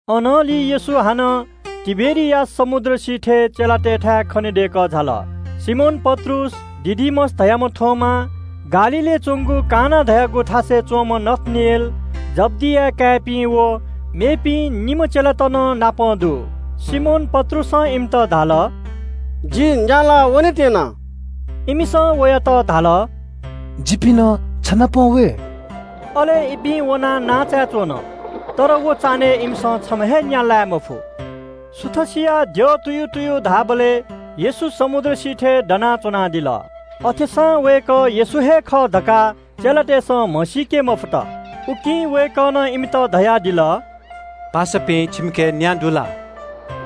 अनंलि येशू हानं तिबेरियास समुद्र सिथय् चेलातय्‌थाय् खनेदय्‌कः झाल। सिमोन पत्रुस, दिदुमस धाःम्‍ह थोमा, गालीलय् च्‍वंगु काना धाःगु थासय् च्‍वंम्‍ह नथानेल, जब्‍दिया काय्‌पिं व मेपिं निम्‍ह चेलात नं नापं दु। सिमोन पत्रुसं इमित धाल – “जि न्‍या लाः वनेत्‍यना।” इमिसं वयात धाल – “जिपिं नं छ नाप वये।” अले इपिं वनाः नांचाय् च्‍वन। तर व चान्‍हय् इमिसं छम्‍ह हे न्‍या लाये मफु। सुथ जूबलय् येशू समुद्र सिथय् दना च्‍वनादिल। अथेसां वय्‌कः येशू हे खः धकाः चेलातय्‌सं म्‍हसीके मफुत। उकिं वय्‌कलं इमित धयादिल – “पासापिं, छिमिके न्‍या दु ला?”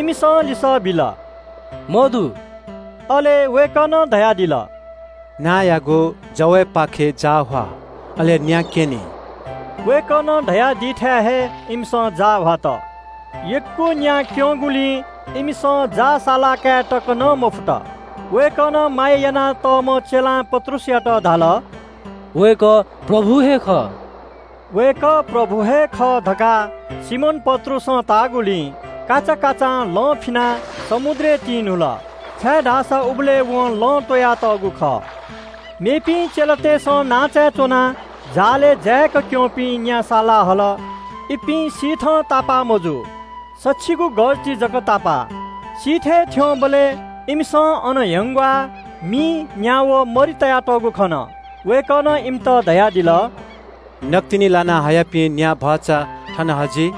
इमिसं लिसः बिल – “मदु।” अले वय्‌कलं धयादिल – “नांचायागु जवय्‌पाखे जाः ह्वा, अले न्‍या क्‍यनी।” वय्‌कलं धयादीथाय् हे इमिसं जाः ह्वात। यक्‍व न्‍या क्‍यंगुलिं इमिसं जाः सालाकाये तक नं मफुत। वय्‌कलं माया यानातःम्‍ह चेलां पत्रुसयात धाल – “वय्‌कः प्रभु हे खः।” वय्‌कः प्रभु हे खः धकाः सिमोन पत्रुसं ताःगुलिं काचाकाचां लं फिनाः समुद्रय् तिन्‍हुल, छाय्‌धाःसा उबलय् वं लं त्‍वयातःगु खः। मेपिं चेलातय्‌सं नांचाय् च्‍वनाः जालय् जाय्‌क क्‍यंपिं न्‍या सालाहल। इपिं सिथं तापाः मजू। सछिगू मिटर ति जक तापाः। सिथय् थ्‍यंबलय् इमिसं अन च्‍यानाच्‍वंगु ह्यंग्‍वालय् न्‍या व मरि तयातःगु खन। वय्‌कलं इमित धयादिल – “नकतिनि लाना हयापिं न्‍या भचा थन हजि।”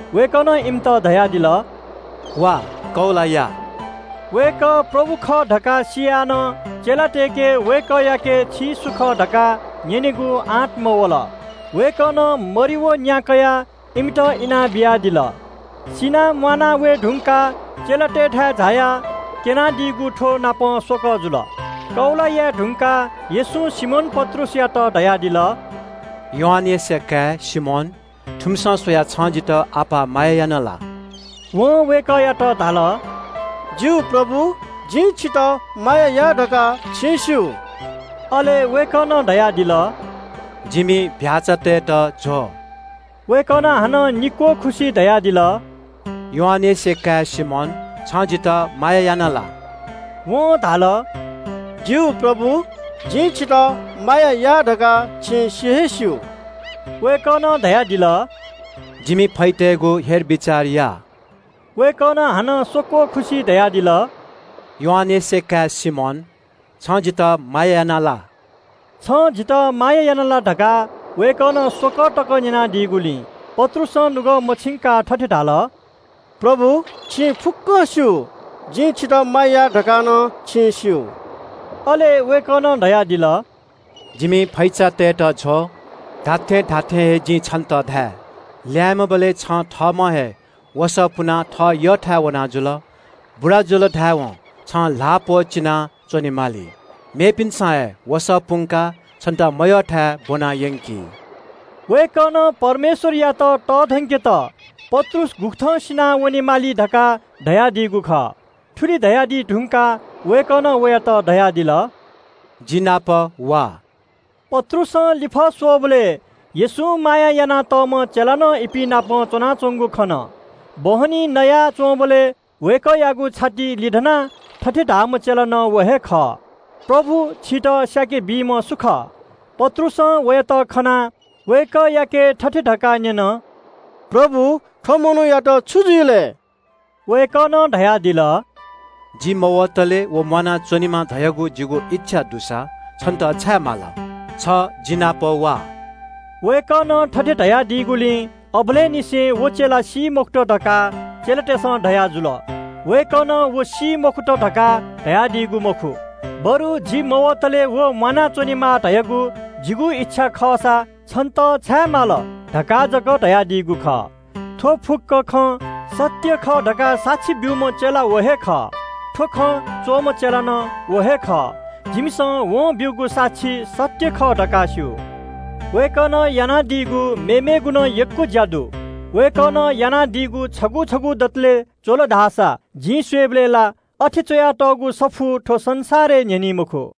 वय्‌कलं इमित धयादिल – “वा, नः वा!” वय्‌कः प्रभु खः धकाः सियाः नं चेलातय्‌सं वय्‌कःयाके “छि सु खः” धकाः न्‍यनेगु आँट मयात। वय्‌कलं मरि व न्‍या कयाः इमित इनाबियादिल। सिनाः म्‍वाना वये धुंकाः चेलातय्‌थाय् झायाः क्‍यनादीगु थ्‍वनापं स्‍वकः जुल। नयेनी धुंकाः येशूं सिमोन पत्रुसयात धयादिल – “यूहन्‍नाया काय् सिमोन, थुमिसं स्‍वयाः छं जितः अप्‍वः माया याना ला?” वं वय्‌कःयात धाल – “खः प्रभु, जिं छितः माया याः धकाः छिं स्‍यू।” अले वय्‌कलं धयादिल – “जिमि चीधिकःपिं भ्‍याःचातय्‌त ज्‍व।” वय्‌कलं हानं निक्‍वः खुसि धयादिल – “यूहन्‍नाया काय् सिमोन, छु छं जितः माया याना ला?” वं धाल “खः प्रभु, जिं छितः माया याः धकाः छिं सि हे स्‍यू।” वय्‌कलं धयादिल – “जिमि फैचातय्‌त बिचाः या।” वय्‌कलं हानं स्‍वक्‍वः खुसि धयादिल – “यूहन्‍नाया काय् सिमोन, छं जितः माया याना ला?” “छं जितः माया याना ला” धकाः वय्‌कलं स्‍वकः तक न्‍यनादीगुलिं पत्रुसं नुगः मछिंकाः थथे धाल – “प्रभु, छिं फुक्‍कं स्‍यू, जिं छितः माया याः धकाः नं छिं स्‍यू।” अले वय्‌कलं धयादिल – “जिमि फैचातय्‌त ज्व। “जिं छन्‍त खःगु खँ धाये – ल्‍याय्‌म्‍हबलय् छं थःम्‍हं हे वसः पुनाः थः यःथाय् वना जुल। बुरा जुल धाय्‌वं छं ल्‍हाः प्‍वःचिनाः च्‍वनेमाली। मेपिन्‍सं हे वसः पुंकाः छन्‍त मयःथाय् ब्‍वना यंकी।” वय्‌कलं परमेश्‍वरयात तःधंकेत पत्रुस गुकथं सिनावनेमाली धकाः धयादीगु खः। थुलि धयादी धुंकाः वयात धयादिल – “जिगु ल्‍यूल्‍यू वा।” पत्रुसं लिफः स्‍वःबलय् येशूं माया यानातःम्‍ह चेला नं इपिं नाप वयाच्‍वंगु खन। बहनी भ्‍वय् नयाच्‍वंबलय् वय्‌कःयागु छातिइ लिधनाः थथे धाःम्‍ह चेला व हे खः – “प्रभु, छितः धोखा बीम्‍ह सु खः?” पत्रुसं वयात खनाः वय्‌कःयाके थथे धकाः न्‍यन – “प्रभु, वयात छु जुइ लय्?” वय्‌कलं धयादिल – “जि मवतले व म्‍वानाच्‍वनेमा धयागु जिगु इच्‍छा दुसा छन्‍त छाय् माल?” छ जिनापं वा। वय्‌कलं थथे धयादीगुलिं अबलय् निसें व चेला सी मखुत धकाः चेलातय्‌सं धयाजुल। वय्‌कलं व सी मखुत धकाः धयादीगु मखु, बरु “जि मवतले व म्‍वानाच्‍वनेमा धयागु जिगु इच्‍छा खःसा छन्‍त छाय् माल?” धकाः जक धयादीगु खः। थ्‍व फुक्‍क खँ सत्‍य खः धकाः साक्षी ब्‍यूम्‍ह चेला व हे खः। थ्‍व खँ च्‍वःम्‍ह चेला नं व हे खः। जिमिसं वं ब्‍यूगु साक्षी सत्‍य खः धकाः स्‍यू। वय्‌कलं यानादीगु मेमेगु नं यक्‍व ज्‍या दु। वय्‌कलं यानादीगु छगू छगू दतले च्‍वल धाःसा जिं स्‍वयेबलय् ला अथे च्‍वयातःगु सफू थ्‍व संसारय् न्‍ह्यनी मखु।